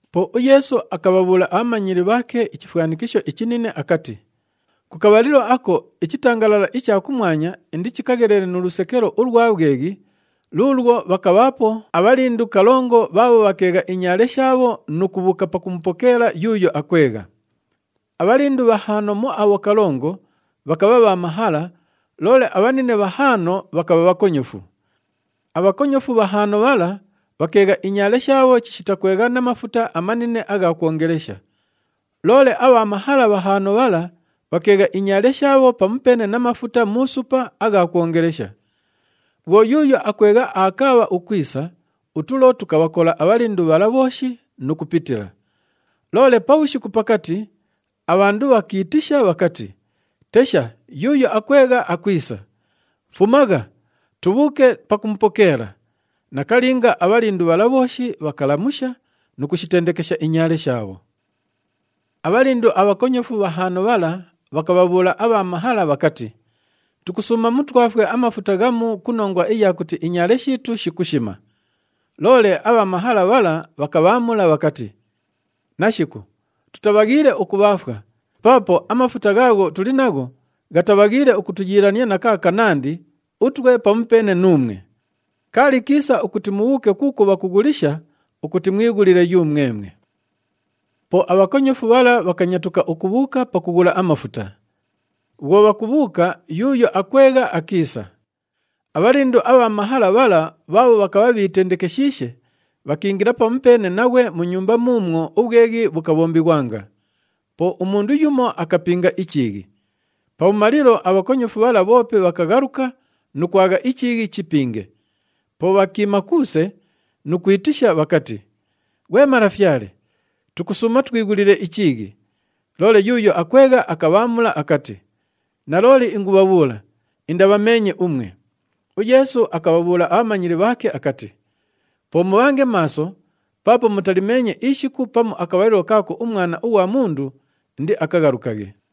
Po uYeesu akabhabhuula abhamanyili bhaake ichifwanikisho ichinine akati, “Ku kabhalilo ako, ichitangalala icha kumwanya indichikaghelele nu lusekelo ulwa bhweghi, luulwo bhakabhaapo abhalindu kalongo bhaabho bhakeegha inyaale shaabho nu kubhuuka pakumupokeela yuuyo akwegha. Abhalindu bhahaano mu abho kalongo, bhakabha bha mahala, loole abhanine bhahaano bhakabha bhakonyofu. Abhakonyofu bhahaano bhala, bhakeegha inyaale shaabho chishita kwegha na mafuta amanine agha kwongelesha. Loole abha mahala bhahaano bhala bhakeegha inyaale shaabho pamupeene na mafuta mu supa agha kwongelesha. Bhwo yuuyo akwegha aakaabha ukwisa, utulo tukabhakola abhalindu bhala bhooshi nu kupitila. Loole pabhushiku pakati, abhandu bhakiitisha bhakati, ‘Tesha, yuuyo akwegha akwisa! Fumagha, tubhuuke pakumupokeela.’ Nakalinga, abhalindu bhala bhooshi bhakalamusha nu kushitendekesha inyaale shaabho. “Abhalindu abhakonyofu bhahaano bhala bhakabhabhuula abha mahala bhakati, ‘Tukusuuma mutwafwe amafuta ghamu ku nongwa iya kuti inyaale shiitu shikushima.’ Loole abha mahala bhala bhakabhaamula bhakati, ‘Nashiku! Tutabhaghiile ukubhaafwa, paapo amafuta ghaagho tuli nagho, ghatabhaghiile ukutuyiilania na kaakanandi utwe pamupeene nuumwe. Kaali kiisa ukuti mubhuuke kuukwo bhakughulisha ukuti mwighulile yumwemwe.’ “Po abhakonyofu bhala bhakanyatuka ukubhuuka pakughula amafuta. Bhwo bhakubhuuka, yuuyo akwegha akiisa. Abhalindu abha mahala bhala bhaabho bhakabha bhiitendekeshiishe, bhakiingila pamupeene naghwe mu nyumba muumwo ubhweghi bhukabhombighwanga. Po umundu yumo akapinga ichiighi. Pabhumalilo abhakonyofu bhala bhoope bhakaghaluka nu kwagha ichiighi chipinge. Po bhakiima kuuse nu kwitisha bhakati, ‘Ghwe malafyale, tukusuuma utwighulile ichiighi!’ Loole yuuyo akwegha akabhaamula akati, ‘Nalooli ingubhabhuula, indabhameenye umwe!’” UYeesu akabhabhuula abhamanyili bhaake akati, “Po mubhange maaso paapo mutalimeenye ishiku pamu akabhalilo kaako uMwana ughwa Mundu indiakaghalukaghe.”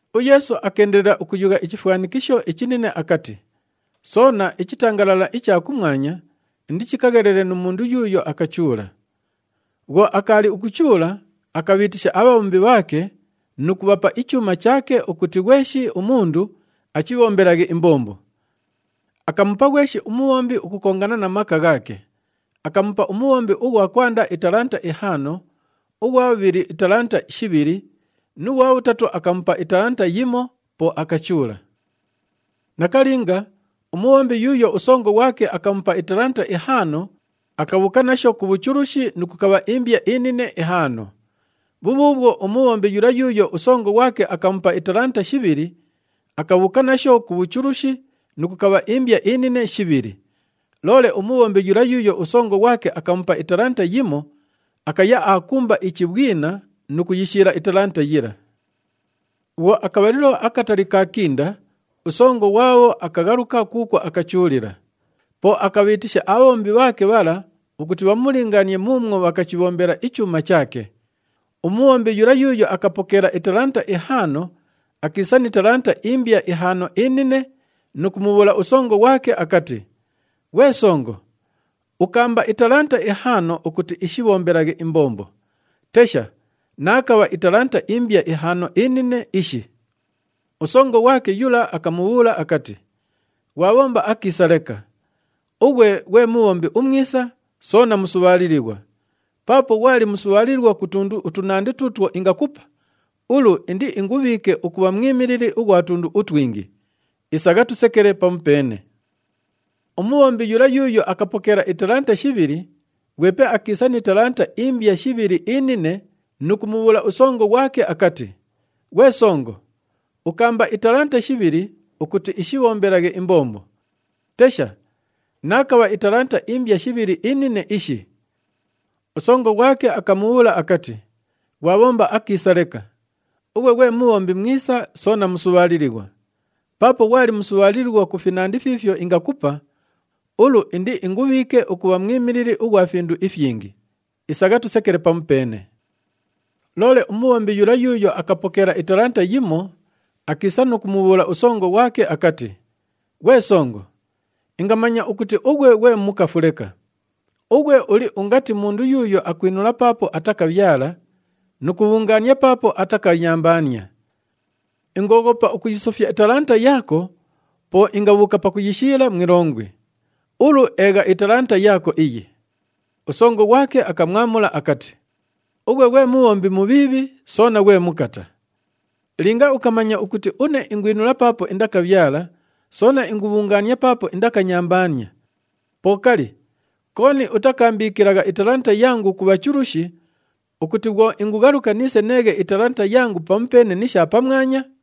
UYeesu akeendelela ukuyugha ichifwanikisho ichinine akati, “Soona, ichitangalala icha kumwanya indichikaghelele nu mundu yuuyo akachuula. Bhwo akaali ukuchuula, akabhiitisha abhabhombi bhaake nu kubhapa ichuuma chaake ukuti ghweshi umundu achibhombelaghe imbombo. Akamupa ghweshi umubhombi ukukongana na maka ghaake. Akamupa umubhombi ughwa kwanda italanta ihaano, ughwa bhubhili italanta shibhili nu ghwa bhutatu akamupa italanta yimo, po akachuula. “Nakalinga, umubhombi yuuyo usongo ghwake akamupa italanta ihaano, akabhuuka nasho ku bhuchulushi nu kukabha imbya inine ihaano. Bhubhuubhwo, umubhombi yula yuuyo usongo ghwake akamupa italanta shibhili, akabhuuka nasho ku bhuchulushi nu kukabha imbya inine shibhili. Loole umubhombi yula yuuyo usongo ghwake akamupa italanta yimo, akaya aakumba ichibhwina nu kuyishiila italanta yila. “Bhwo akabhalilo akatali kaakinda, usongo ghwabho akaghaluka kuukwo akachuulila. Po akabhiitisha abhabhombi bhaake bhala ukuti bhamulingaanie muumwo bhakachibhombela ichuuma chaake. Umubhombi yula yuuyo akapokeela italanta ihaano, akiisa ni talanta imbya ihaano inine nu kumubhuula usongo ghwake akati, ‘Ghwe songo, ukaamba italanta ihaano ukuti ishibhombelaghe imbombo, tesha, naakabha italanta imbya ihaano inine ishi.’ Usongo ghwake yula akamubhuula akati, ‘Ghwabhomba akiisa leka. Ughwe ghwe mubhombi umwisa soona musubhaalilighwa! Paapo ghwali musubhaalilighwa ku tundu utunandi tuutwo ingakupa, ulu indiingubhiike ukubha mwimilili ughwa tundu utwingi. Isagha tusekele pamupeene.’ “Umubhombi yula yuuyo akapokeela italanta shibhili, ghwepe akiisa ni talanta imbya shibhili inine nu kumubhuula usongo ghwake akati, ‘Ghwe songo, ukaamba italanta shibhili ukuti ishibhombelaghe imbombo, tesha, naakabha italanta imbya shibhili inine ishi.’ Usongo ghwake akamubhuula akati, ‘Ghwabhomba akiisa leka. Ughwe ghwe mubhombi mwisa soona musubhaalilighwa! Paapo ghwali musubhaalilighwa ku finandi fiifyo ingakupa, ulu indiingubhiike ukubha mwimilili ughwa findu ifyingi. Isagha tusekele pamupeene.’ “Loole umubhombi yula yuuyo akapokeela italanta yimo, akiisa nu kumubhuula usongo ghwake akati, ‘Ghwe songo, ingamanya ukuti ughwe ghwe mukafu leka. Ughwe uli ungati mundu yuuyo akwinula paapo atakabhyala nu kubhungaania paapo atakanyambaania. Ingooghopa ukuyisofya italanta yaako, po ingabhuuka pakuyishiila mu ilongwi. Ulu, eegha italanta yaako iyi.’ Usongo ghwake akamwamula akati, ‘Ughwe ghwe mubhombi mubhiibhi soona ghwe mukata! Linga ukamanya ukuti une ingwinula paapo indakabhyala, soona ingubhungaania paapo indakanyambaania, po kali, kooni utakaambiikilagha italanta yangu ku bhachulushi ukuti bhwo ingughaluka niise neeghe italanta yangu pamupeene ni sha pamwanya?’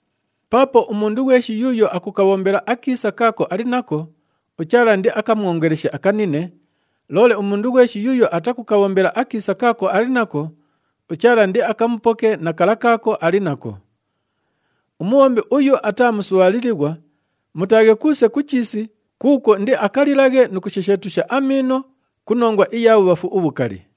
“Paapo umundu ghweshi yuuyo akukabhombela akiisa kaako ali nako, uChaala indiakamwongeleshe akanine, loole umundu ghweshi yuuyo atakukabhombela akiisa kaako ali nako, uChaala indiakamupoke na kala kaako ali nako. Umubhombi uyu ataa musubhaalilighwa, mutaaghe kuuse ku chiisi kuukwo indiakalilaghe nu kushesheetusha amiino ku nongwa iya bhubhafu ubhukali.”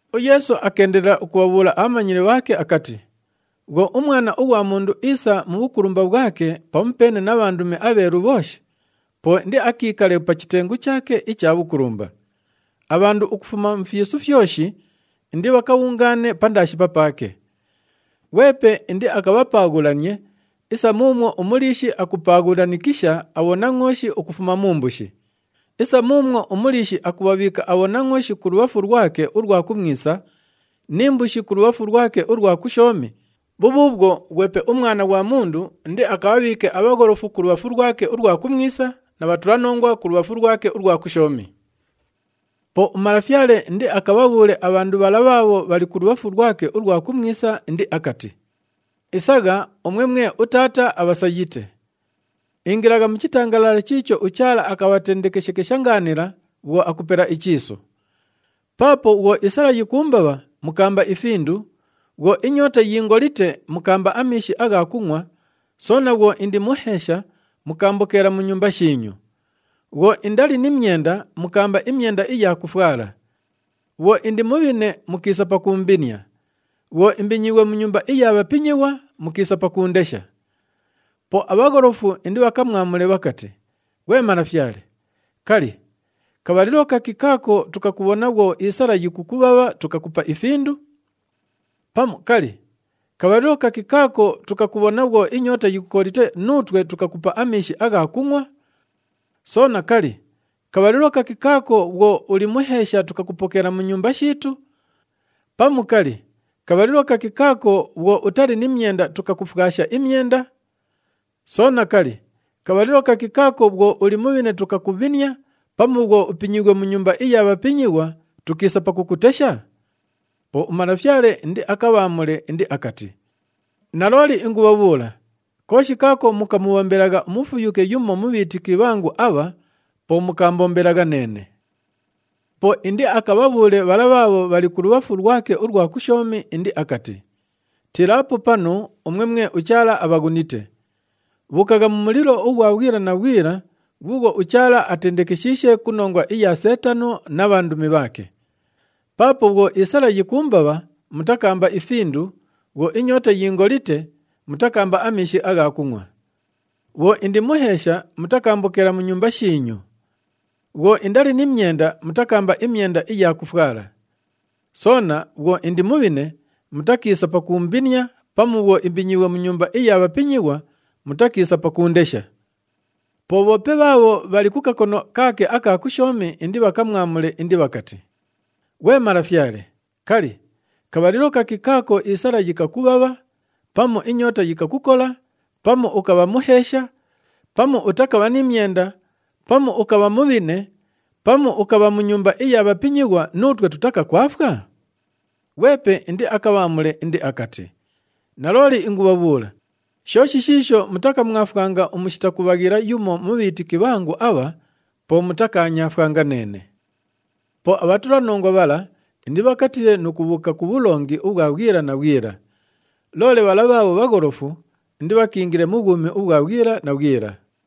UYeesu akeendelela ukubhabhuula abhamanyili bhaake akati, “Bhwo uMwana ughwa Mundu iisa mu bhukulumba bhwake pamupeene na bhandumi abheelu bhooshi, po indiakiikale pa chitengu chaake icha bhukulumba. Abhandu ukufuma mu fyisu fyoshi indibhakabhungaane pandaashi papaake. Ghwepe indiakabhapaaghulanie isa muumwo umuliishi akupaaghulanikisha abhonangʼooshi ukufuma mu mbushi. Isa muumwo umuliishi akubhabhiika abhonangʼooshi kulubhafu lwake ulwa kumwisa ni mbushi kulubhafu lwake ulwa kushoomi, bhubhuubhwo, ghwepe uMwana ghwa Mundu indiakabhabhiike abhagholofu kulubhafu lwake ulwa kumwisa, na bhatulanongwa kulubhafu lwake ulwa kushoomi. “Po uMalafyale indiakabhabhuule abhandu bhala bhaabho bhali kulubhafu lwake ulwa kumwisa indiakati, ‘Isagha, umwe mwe uTaata abhasayite. Ingilagha mu chitangalala chiicho uChaala akabhatendekeshekesha ngaanila bhwo akupela ichiisu. Paapo bhwo isala yikuumbabha, mukaamba ifindu, bhwo inyoota yiingolite, mukaamba amiishi agha kungʼwa, soona bhwo indi muheesha, mukaambokeela mu nyumba shiinyu. Bhwo indali ni myenda, mukaamba imyenda iya kufwala. Bhwo indi mubhine, mukiisa pakuumbinia. Bhwo imbinyiighwe mu nyumba iya bhapinyighwa, mukiisa pakuundesha.’ Po abhagholofu indibhakamwamule bhakati, ‘Ghwe Malafyale, kali, kabhalilo kaki kaako tukakubhona bhwo isala yikukubhabha tukakupa ifindu? Pamu kali, kabhalilo kaki kaako tukakubhona bhwo inyoota yikukolite nuutwe tukakupa amiishi agha kungʼwa? Soona, kali, kabhalilo kaki kaako bhwo uli muheesha tukakupokeela mu nyumba shiitu? Pamu kali, kabhalilo kaki kaako bhwo utali ni myenda tukakufwasha imyenda? Soona, kali, kabhalilo kaki kaako bhwo uli mubhine tukakubhinia, pamu bhwo upinyiighwe mu nyumba iya bhapinyighwa tukiisa pakukutesha?’ Po uMalafyale indiakabhaamule indiakati, ‘Nalooli ingubhabhuula, kooshi kaako mukamubhombelagha umufuyuke yumo mu bhiitiki bhangu abha, po mukaambombelagha neene.’ “Po indiakabhabhuule bhala bhaabho bhali kulubhafu lwake ulwa kushoomi indiakati, ‘Tiilaapo panu umwe mwe uChaala abhaghunite! Bhuukagha mu mulilo ughwa bhwila na bhwila ghuughwo uChaala atendekeshiishe ku nongwa iya Seetano na bhandumi bhaake. Paapo bhwo isala yikuumbabha, mutakaamba ifindu, bhwo inyoota yiingolite, mutakaamba amiishi agha kungʼwa. Bhwo indi muheesha, mutakaambokeela mu nyumba shiinyu. Bhwo indali ni myenda, mutakaamba imyenda iya kufwala. Soona bhwo indi mubhine, mutakiisa pakuumbinia pamu bhwo imbinyiighwe mu nyumba iya bhapinyighwa, mutakiisa pakuundesha.’ Po bhoope bhaabho bhali ku kakono kaake aka kushoomi indibhakamwamule indibhakati, ‘Ghwe Malafyale, kali, kabhalilo kaki kaako isala yikakubhabha, pamu inyoota yikakukola, pamu ukabha muheesha, pamu utakabha ni myenda, pamu ukabha mubhine, pamu ukabha mu nyumba iya bhapinyighwa, nuutwe tutakakwafwa?’ Ghwepe indiakabhaamule indiakati, ‘Nalooli ingubhabhuula, shooshi shiisho mutakamwafwanga umushita kubhaghila yumo mu bhiitiki bhangu abha, po mutakaanyaafwanga neene.’ “Po abhatulanongwa bhala indibhakatiile nu kubhuuka ku bhulongi ubhwa bhwila na bhwila. Loole bhala bhaabho bhagholofu, indibhakiingile mu bhwumi ubhwa bhwila na bhwila.”